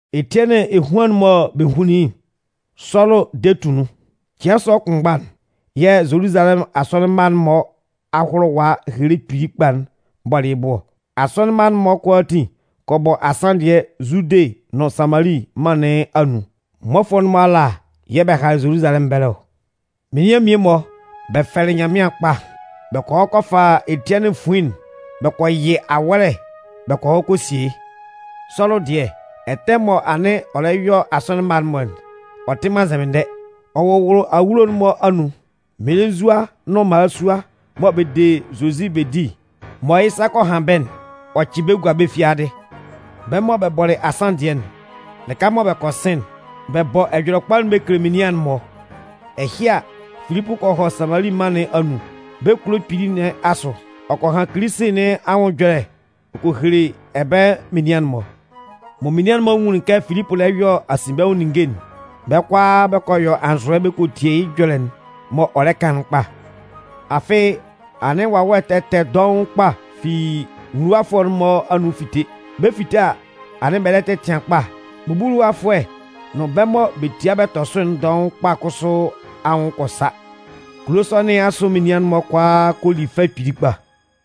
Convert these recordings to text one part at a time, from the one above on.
Etiɛnɩn ehuan'n mɔ bɛ hunlin yɩ́'n, Sɔlʋ de tʋ nun. Cɩan sɔ kʋnmgba'n, yɛ̂ Zoluzalɛmʋn asɔnɩn mma'n-mɔ ahʋlʋwa ehele kpili kpa'n bɔlɩ yɩ́ bʋ ɔ. Asɔnɩn mma'n-mɔ kʋalaatin kɔ bɔ asanndɩɛ Zude nʋn Samali mân nɩn anun. Mmɔfʋɛ'n-mɔ ala yɛ̂ bɛ halɩ Zoluzalɛmʋn ɛbɛlɛ ɔ. Menian mmie-mɔ, bɛ fɛlɩ Nyanmɩan kpa, bɛ kɔ hɔ kɔ fa Etiɛnɩn fuin'n bɛ kɔ yɩ awɔ́lɛ bɛ kɔ hɔ kɔ sie yɩ́. Sɔlʋ dɩɛ, ɛtɛ mɔ anɩn ɔ lɛ yɔ asɔnɩn mma'n-mɔ'n, ɔ tɩ man nzɛmɩndɛ. Ɔ wʋwʋlʋ awulo'n-mɔ anun, mmelenzua nʋn mmalasua mɔ bɛ de Zozi bɛ di mɔ yɩ́ sa kɔ han bɛ́'n, ɔ cɩ bɛ́ gua bɛ́ fiadɩ. Bɛ́ mɔ bɛ bɔlɩ asanndɩɛ'n, lɩka mɔ bɛ kɔ sɩn'n, bɛ bɔ Ɛjɔlɛkpa bɛ kele menian'n-mɔ. Ɛhɩ a, Filipʋ kɔ hɔ Samali mân nɩn anun, bɛ́ kulo kpili nɩn asʋ. Ɔ kɔ han Kilisi nɩn anwʋn ɛjɔlɛ'n ɔ kɔ hele ɛbɛlɛ menian'n-mɔ. Mɔ menian'n-mɔ nwunlin kɛ Filipʋ lɛ yɔ asinbɛnwʋn ninnge'n, bɛ́ kʋalaa bɛ kɔ yɔ anzʋɛ bɛ kɔ tie yɩ́ ɛjɔlɛ'n m'ɔ lɛ kan'n kpa. Afɩ anɩn wawɛ ɛtɛ ɛtɛ dɔʋn kpa fi nwuluwafʋɛ'n-mɔ anun fite. Bɛ 'fite a, anɩn bɛ lɛ tɛtɩan kpa. Bubuluwafʋɛ nʋn bɛ́ mɔ bɛ tia bɛ tɔ sʋ'n dɔʋn kpa kʋsʋ anwʋn kɔ sa. Kulo sɔ nɩn asʋ menian'n-mɔ kʋalaa kɔ li fɛ kpili kpa.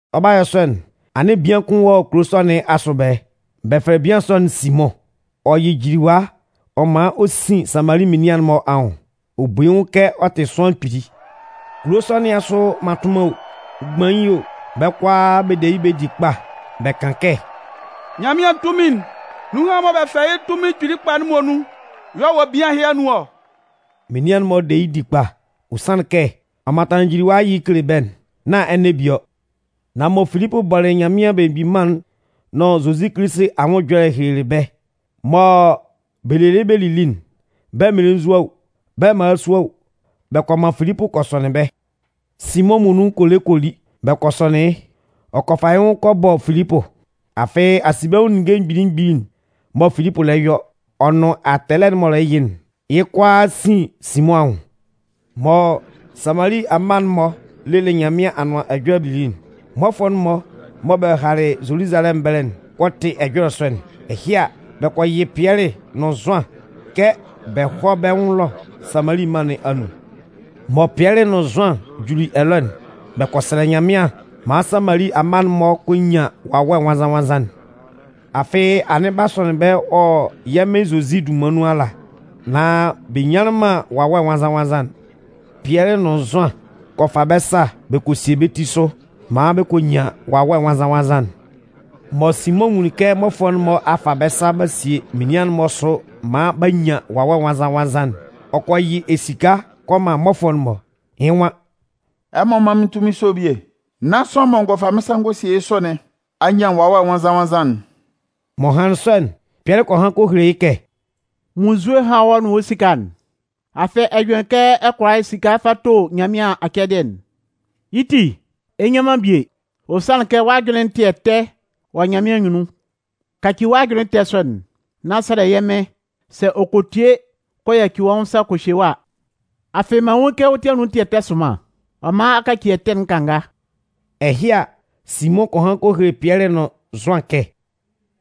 Ɔ 'ba yɔ sɔ'n, anɩn bian kʋn wɔ kulo sɔ nɩn asʋ ɛbɛlɛ. Bɛ fɛlɛ bian sɔ'n Simʋn. Ɔ yɩ jiliwa ɔ man ɔ sin Samali menian'n-mɔ anwʋn. Ɔ bu yɩ́ nwʋn kɛ ɔ tɩ sʋanlan kpili. Kulo nɩn asʋ mmatʋnman o, mgbain o, bɛ́ kʋalaa bɛ de yɩ́ bɛ di kpa. Bɛ kan kɛ: “Nyanmɩan tunmin'n, nunhan'n mɔ bɛ fɛlɛ yɩ́ tunmin kpili kpa'n muonun y'ɔ wɔ bian ɛhɩ anun ɔ.” Menian'n-mɔ de yɩ́ di kpa, ɔ sanlɩn kɛ, ɔ mantanlɩn jiliwa'n yɩ kele bɛ́'n nán ɛnɛ bie ɔ. Nan mɔ Filipʋ bɔlɩ Nyanmɩan Belemgbin Mân'n nʋn Zozi Kilisi anwʋn ɛjɔlɛ'n helelɩ bɛ́, mɔ bɛ lelɩ bɛ lili'n, bɛ mmelenzua o, bɛ́ mmalasua o, bɛ kɔ man Filipʋ kɔ sɔnɩn bɛ́. Simʋn muonun kɔ le kɔ li, bɛ kɔ sɔnɩn yɩ́. Ɔ kɔ fa yɩ́ nwʋn kɔ bɔ Filipʋ. Afɩ asinbɛnwʋn ninnge mgbili mgbili'n mɔ Filipʋ lɛ yɔ, ɔ nʋn atɛlɛ'n m'ɔ lɛ yɩ'n, yɩ́ kʋalaa sin Simʋn anwʋn. Mɔ Samali amma'n-mɔ lelɩ Nyanmɩan Anʋan Ɛjɔlɛ'n lili'n, mmɔfʋɛ'n-mɔ mɔ bɛ halɩ Zoluzalɛmʋn ɛbɛlɛ'n kɔ tɩ ɛjɔlɛ sɔ'n. Ɛhɩ a, bɛ kɔ yɩ́ Pɩɛlɩ nʋn Zʋan kɛ bɛ hɔ́ bɛ́ nwʋn ɛlɔ Samali mân nɩn anun. Mɔ Pɩɛlɩ nʋn Zʋan juli ɛlɔ'n, bɛ kɔ sɛlɛ Nyanmɩan maan Samali amma'n-mɔ kɔ nyan Wawɛ Nwannzan-nwannzan'n. Afɩ anɩn b'a sɔnɩn bɛ́ wɔ yɛ́ Mɩn Zozi dunman nun ala, nan bɛ nyanlɩn man Wawɛ Nwannzan-nwannzan'n. Pɩɛlɩ nʋn Zʋan kɔ fa bɛ́ sa bɛ kɔ sie bɛ́ sʋ maan bɛ kɔ nyan Wawɛ Nwannzan-nwannzan'n. Mɔ Simʋn nwunlin kɛ mmɔfʋɛ'n-mɔ a fa bɛ́ sa b'a sie menian'n-mɔ sʋ maan b'a nyan Wawɛ Nwannzan-nwannzan'n, ɔ kɔ yɩ esika kɔ man mmɔfʋɛ'n-mɔ. Yɩ́ nwan: “Ɛmɔ mán mɩ́n tunmin sɔ'n bie nán sʋanlan mɔ n gɔ fa mɩ́n sa n gɔ sie yɩ́ sʋ nɩn a nyan Wawɛ Nwannzan-nwannzan'n.” M'ɔ hanlɩn sɔ'n, Pɩɛlɩ kɔ han kɔ hele yɩ́ kɛ: “Munnzue hán wɔ́ nʋn wɔ́ esika'n. Afɩ ɛ jʋnlɩn kɛ ɛ kʋala esika fa to Nyanmɩan acɛdɩɛ'n! Yɩ́ ti, ɛ nnyan man bie, ɔ sanlɩn kɛ wɔ́ ajʋnlɩn tɩ ɛtɛ wɔ Nyanmɩan anyunnun. Kaci wɔ́ ajʋnlɩn ɛtɛ sɔ'n, nán sɛlɛ yɛ́ Mɩn sɛ ɔ kɔ tie kɔ yaci wɔ́ nwʋn sa kɔ hye wɔ́ a. Afɩ mɩn nwun yɩ́ kɛ wɔ́ ti anun tɩ ɛtɛ sʋnman, ɔ man a kaci ɛtɛ'n kanga.” Ɛhɩ a, Simʋn kɔ han kɔ hele Pɩɛlɩ nʋn Zʋan kɛ: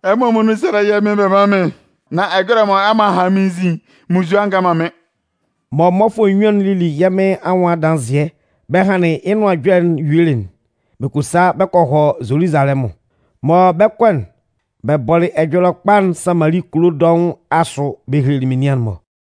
“Ɛmɔ muonun sɛ́lɛ yɛ́ Mɩn bɛ mán mɩ́n nán ɛjɔlɛ'n mɔ ɛmɔ a han nɩn anzin munnzue a ngan man mɩ́n.” Mɔ mmɔfʋɛ nnyuan'n lili yɛ́ Mɩn anwʋn adanzɩɛ bɛ hanlɩn yɩ́ nʋan ɛjɔlɛ'n yuelɩ'n, bɛ kɔ sa bɛ kɔ hɔ Zoluzalɛmʋn. Mɔ bɛ 'kɔ'n, bɛ bɔlɩ Ɛjɔlɛkpa'n Samali kulo dɔʋn asʋ bɛ hele menian'n-mɔ.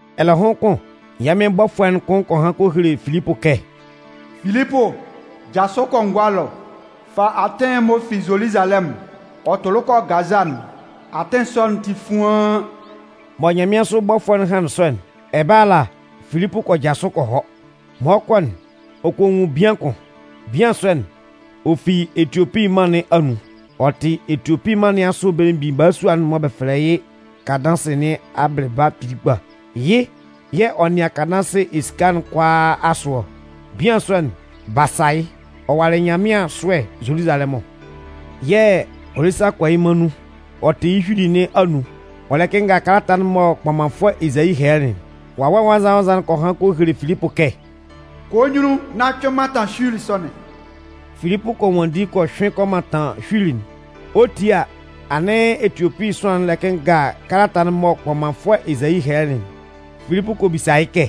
Ɛlɛhʋn kʋn, yɛ́ Mɩn bɔfʋɛ'n kʋn kɔ han kɔ hele Filipʋ kɛ: “Filipʋ, jasʋ kɔ Ngʋa ɛlɔ, fa atɩn'n m'ɔ fi Zoluzalɛmʋn ɔ tʋlʋ kɔ Gaza'n. Atɩn sɔ'n tɩ fuaan.” Mɔ nyanmɩansʋ bɔfʋɛ'n hanlɩn sɔ'n, ɛbɛlɛ ala Filipʋ kɔ jasʋ kɔ hɔ. Mɔ ɔ 'kɔ'n, ɔ kɔ nwun bian kʋn. Bian sɔ'n, ɔ fi Etiopi mân nɩn anun. Ɔ tɩ Etiopi mân nɩn asʋ belemgbin balasua'n mɔ bɛ fɛlɛ yɩ́ Kandansɩ nɩn abɩlɩba kpili kpa. Yɩ́ yɛ̂ ɔ nɩan Kandansɩ esika'n kʋalaa asʋ ɔ. Bian sɔ'n, b'a sa yɩ́. Ɔ walɩ Nyanmɩan ɛsʋɛ Zoluzalɛmʋn yɛ̂ ɔ lɛ sa kɔ yɩ́ mân nun. Ɔ tɩ yɩ́ hyuili nɩn anun, ɔ lɛ kɩnnga kalata'n mɔ kpɔmanfʋɛ Ezayi hɛlɛlɩ'n. Wawɛ Nwannzan-nwannzan'n kɔ han kɔ hele Filipʋ kɛ: “Kɔ wɔ́ nyunnun nán cʋɩn mantan hyuili sɔ'n.” Filipʋ kɔ nwanndi kɔ hyʋɩn kɔ mantan hyuili'n. Ɔ 'tie a, anɩn Etiopi sʋanlan'n lɛ kɩnnga kalata'n mɔ kpɔmanfʋɛ Ezayi hɛlɛlɩ'n. Filipʋ kɔ bisa yɩ́ kɛ: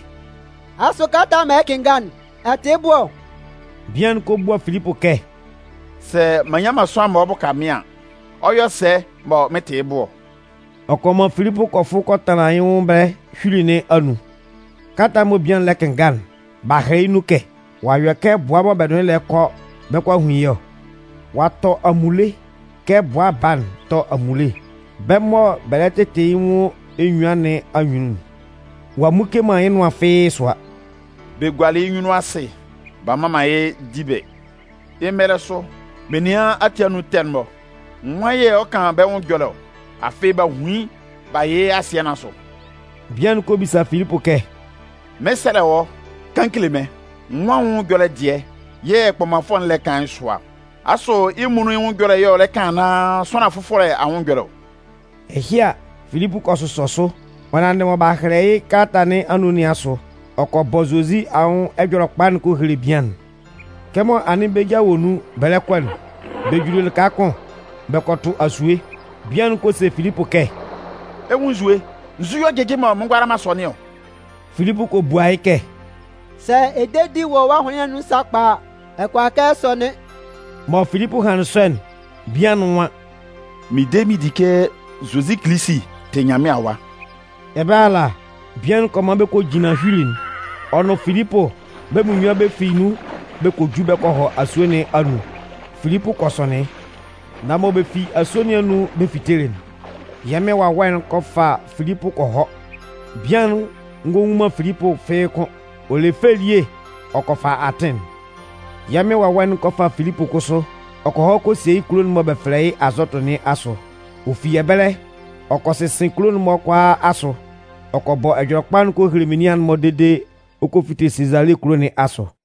“Asʋ kalata'n mɔ ɛ lɛ kɩnnga'n, ɛ tɩ yɩ́ bʋ ɔ?” Bian'n kɔ bua Filipʋ kɛ: “Sɛ m'an nnyan man sʋanlan mɔ ɔ 'bʋka mɩ́n an, ɔ 'yɔ sɛ mɔ mɩn 'tɩ yɩ́ bʋ ɔ?” Ɔ kɔ man Filipʋ kɔ fʋ kɔ tanlan yɩ́ nwʋn ɛbɛlɛ hyuili nɩn anun. Kalata'n lɩka mɔ bian'n lɛ kɩnnga'n, b'a hɛlɛ yɩ́ nun kɛ: Ɔ'a yɔ kɛ bʋa mɔ bɛ nʋn yɩ́ lɛ kɔ bɛ 'kɔ a hun yɩ́ ɔ. Ɔ'a tɔ amunle kɛ bʋa baa'n tɔ amunle bɛ́ mɔ bɛ lɛ tɩtɩ yɩ́ nwʋn enyuan nɩn anyunnun'n. Ɔ'a mmuke man yɩ́ nʋan fɩ́ɩ́ sʋa. Bɛ gualɩ yɩ́ nyunnun asɩ, b'a mman man yɩ́ dibɩ. Yɩ́ mɛlɛ sʋ menian ati anun ɛtɛ'n-mɔ, nwan yɛ̂ ɔ 'kan bɛ́ nwʋn ɛjɔlɛ ɔ? Afɩ b'a hun yɩ́ b'a yɩ yɩ́ asɩɛ nɩn asʋ. Bian'n kɔ bisa Filipʋ kɛ: “Mɩn 'sɛlɛ wɔ́, kan kele mɩ́n, nwan anwʋn ɛjɔlɛ dɩɛ yɛ̂ kpɔmanfʋɛ'n lɛ kan yɩ́ sʋa ɔ? Asʋ yɩ́ muonun yɩ́ nwʋn ɛjɔlɛ yɛ́ ɔ lɛ kan anaan sʋanlan fʋfɔlɛ anwʋn ɛjɔlɛ ɔ?” Ɛhɩ a, Filipʋ kɔ sʋsɔ sʋ, ɔ nanndɩ mɔ b'a hɛlɛ yɩ́ kalata nɩn anun nɩn asʋ, ɔ kɔ bɔ Zozi anwʋn Ɛjɔlɛkpa'n ɔ kɔ hele bian'n. Kɛmɔ anɩn bɛ́ ja wɔ nun bɛ lɛ kɔ'n, bɛ juli lɩka kʋn, bɛ kɔ tʋ asue. Bian'n kɔ se Filipʋ kɛ: “Ɛ 'nwun nsue, nzu yɛ̂ ɔ jɩjɩ mɔ mɩn ngʋala man sɔnɩn ɔ?” [ Filipʋ kɔ bua yɩ́ kɛ: “Sɛ ɛ de di wɔ́ ahʋnlɩn nɩn anun sakpa a, ɛ kʋala kɛ ɛ sɔnɩn.” Mɔ Filipʋ hanlɩn sɔ'n, bian'n nwan: “Mɩn de mɩn di kɛ Zozi Kilisi tɩ Nyanmɩan Awa.”] Ɛbɛlɛ ala, bian'n kɔ man bɛ kɔ jinlan hyuili'n. Ɔ nʋn Filipʋ bɛ́ munnyuan bɛ fi nun bɛ kɔ ju bɛ kɔ hɔ asue nɩn anun. Filipʋ kɔ sɔnɩn yɩ́. Nan mɔ bɛ fi asue nɩn anun bɛ fitelɩ'n, yɛ́ Mɩn Wawɛ'n kɔ fa Filipʋ kɔ hɔ. Bian'n ngɔ nwun man Filipʋ fɩ́ɩ́ kʋ́n. Ɔ le fɛ elie ɔ kɔ fa atɩn'n. Yɛ́ Mɩn Wawɛ'n kɔ fa Filipʋ kʋsʋ, ɔ kɔ hɔ kɔ sie yɩ́ kulo'n mɔ bɛ fɛlɛ yɩ́ Azɔtʋ nɩn asʋ. Ɔ fi ɛbɛlɛ, ɔ kɔ sɩsɩn kulo'n-mɔ kʋalaa asʋ, ɔ kɔ bɔ Ɛjɔlɛkpa'n kɔ hele menian'n-mɔ dede ɔ kɔ fite Sezale kulo nɩn asʋ.